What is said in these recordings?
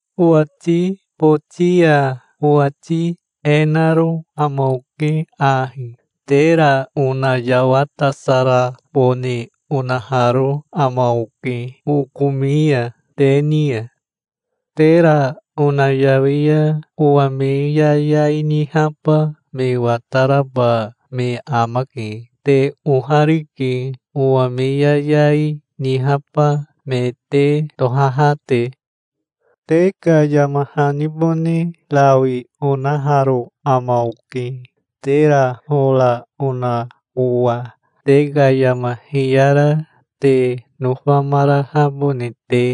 Owati boti ya owati e naro ama oke ahi: Tera onayawatasarabone onaharo ama oke, okomi ya te ni ya. Tera onayawi ya owa me yayai nihaba me wataraba me amake. Te oharike, owa me yayai nihaba me te tohaha te. Te ka yama hanibone rawi onaharo ama oke, tera hora ona owa, te ka yama hiyara te nofamarahabone te.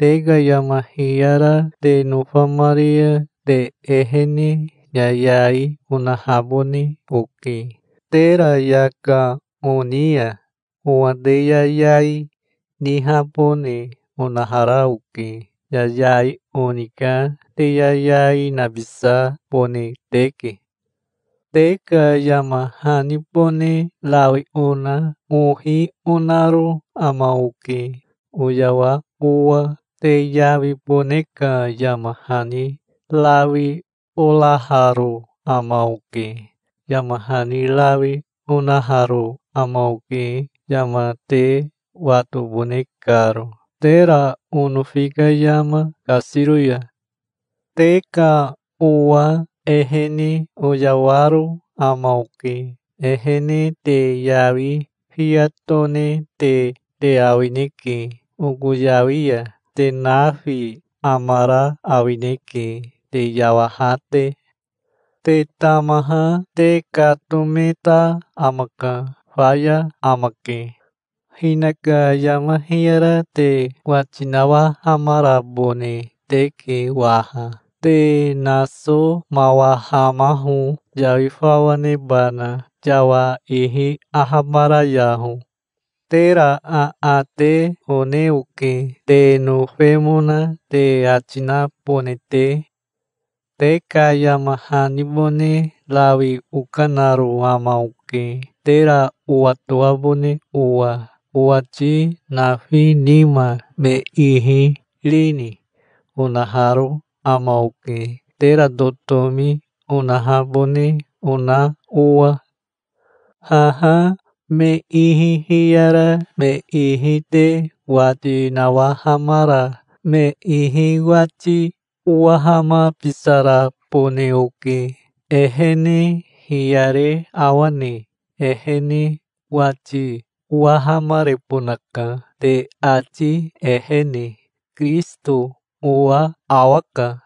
Te ka yama hiyara te nofamari ya te ehene yayai onahabone oke, tera yaka oni ya. Owa te yayai nihabone onahara oke. Yayai oni ka te yayai nabisabone teke. Te ka yama hanibone rawi ona ohi onaro ama oke, oyawa owa. Te yawibone ka yama hani rawi oraharo ama oke. Yama hani rawi onaharo ama oke, yama te watobone karo, tera onofi ka yama kasiro ya. Te ka owa ehene oyawaro ama oke. Ehene te yawi fiya tonete te awineke oko yawi ya. Te nafi amara awineke te yawaha te. Te tamaha te katometa amaka. Faya amake. Hinaka yama hiyara te wati nawahamarabone teke waha. Te nasomawahamaho, yawi fawa nebana. Yawa ihi ahabarayaho. Tera aate one oke, te nofemona te ati nabone te. Te ka yama hanibone rawi okanaro ama oke, tera owatoabone owa. "Owati nafi nima me ihi rini?" onaharo ama oke, tera totomi onahabone ona owa. Haha me ihi hiyara me ihi te wati nawahamara me ihi wati owahamabisarabone oke. Ehene hiyare awane? Ehene wati owahamarebonaka te ati ehene. Kirisito owa awaka.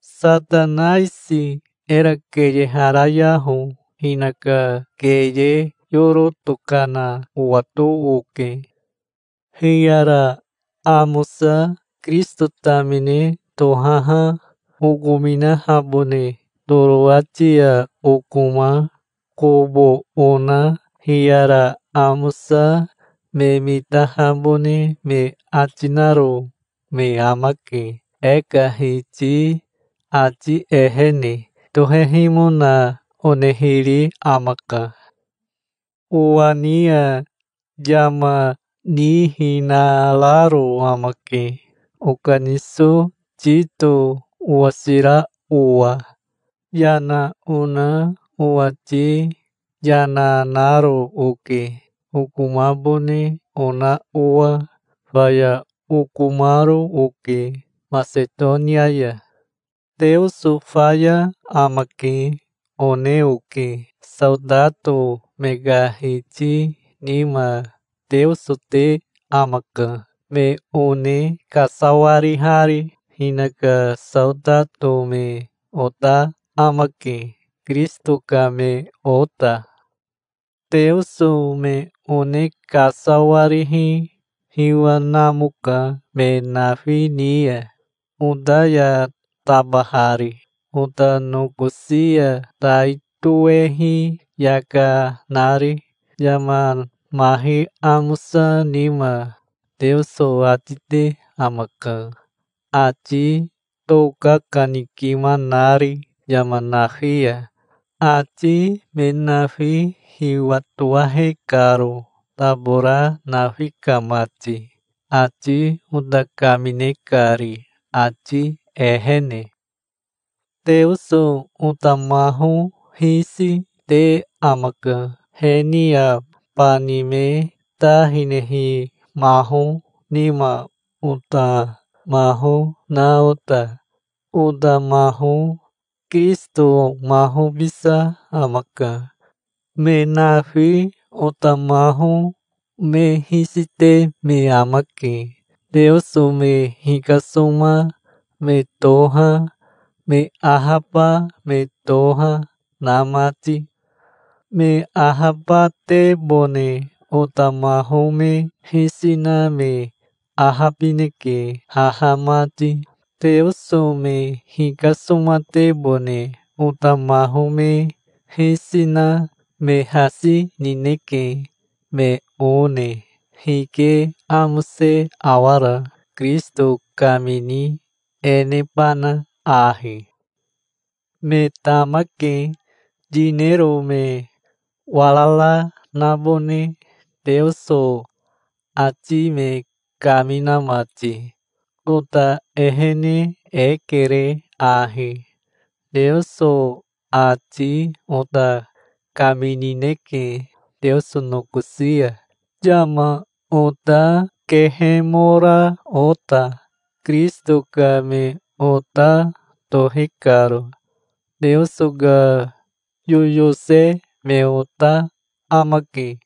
Satanaisi era keyeharayaho. Hinaka keye yoro tokana owato oke. Hiyara amosa Kirisito tamine tohaha okominahabone Torowati ya okoma kobo ona hiyara amosa me mitahabone me ati naro me amake. E ka Hiti ati ehene tohehimona onehiri amaka. Owa ni ya yama nihinararo ama ke, okaniso Tito owasira owa. Yana ona owati yana naro oke, okomabone ona owa. Faya okomaro oke Masetonia ya. "Teoso faya amake", one oke. Saotato me ka hiti nima Teoso te amaka, me one kasawarihari. Hinaka saotato me ota amake, Kirisito ka me ota. Teoso me one kasawarihi hiwa namoka me nafi ni ya, ota ya tabahari, ota nokosi ya tai toehi yaka nari. Yama mahi amosa nima Teoso ati te amaka, ati tokakanikima nari yama nafi ya, ati me nafi hiwatowahe karo, tabora nafi ka mati, ati ota kamine kari, ati ehene. Teoso ota maho hisi, te amaka, he ni ya bani me ta hinehi maho nima ota maho na ota. Ota maho Kirisito mahobisa amaka. Me nafi ota maho me hisi te me amake, Teoso me hikasoma me toha, me ahaba me toha, na mati. Me ahabatebone ota maho me hisi na me ahabineke haha mati. Teoso me hikasomatebone ota maho me hisi na me hasi nineke, me one. Hike amose awara, Kirisito kamini e nebana ahi? Me tamake, yinero me warara nabone Teoso ati me kamina mati. Ota ehene e kere ahi. Teoso ati ota kaminineke Teoso nokosi ya, yama ota kehemora ota, Kirisito ka me ota tohi karo. Teoso ka yoyose me ota amake.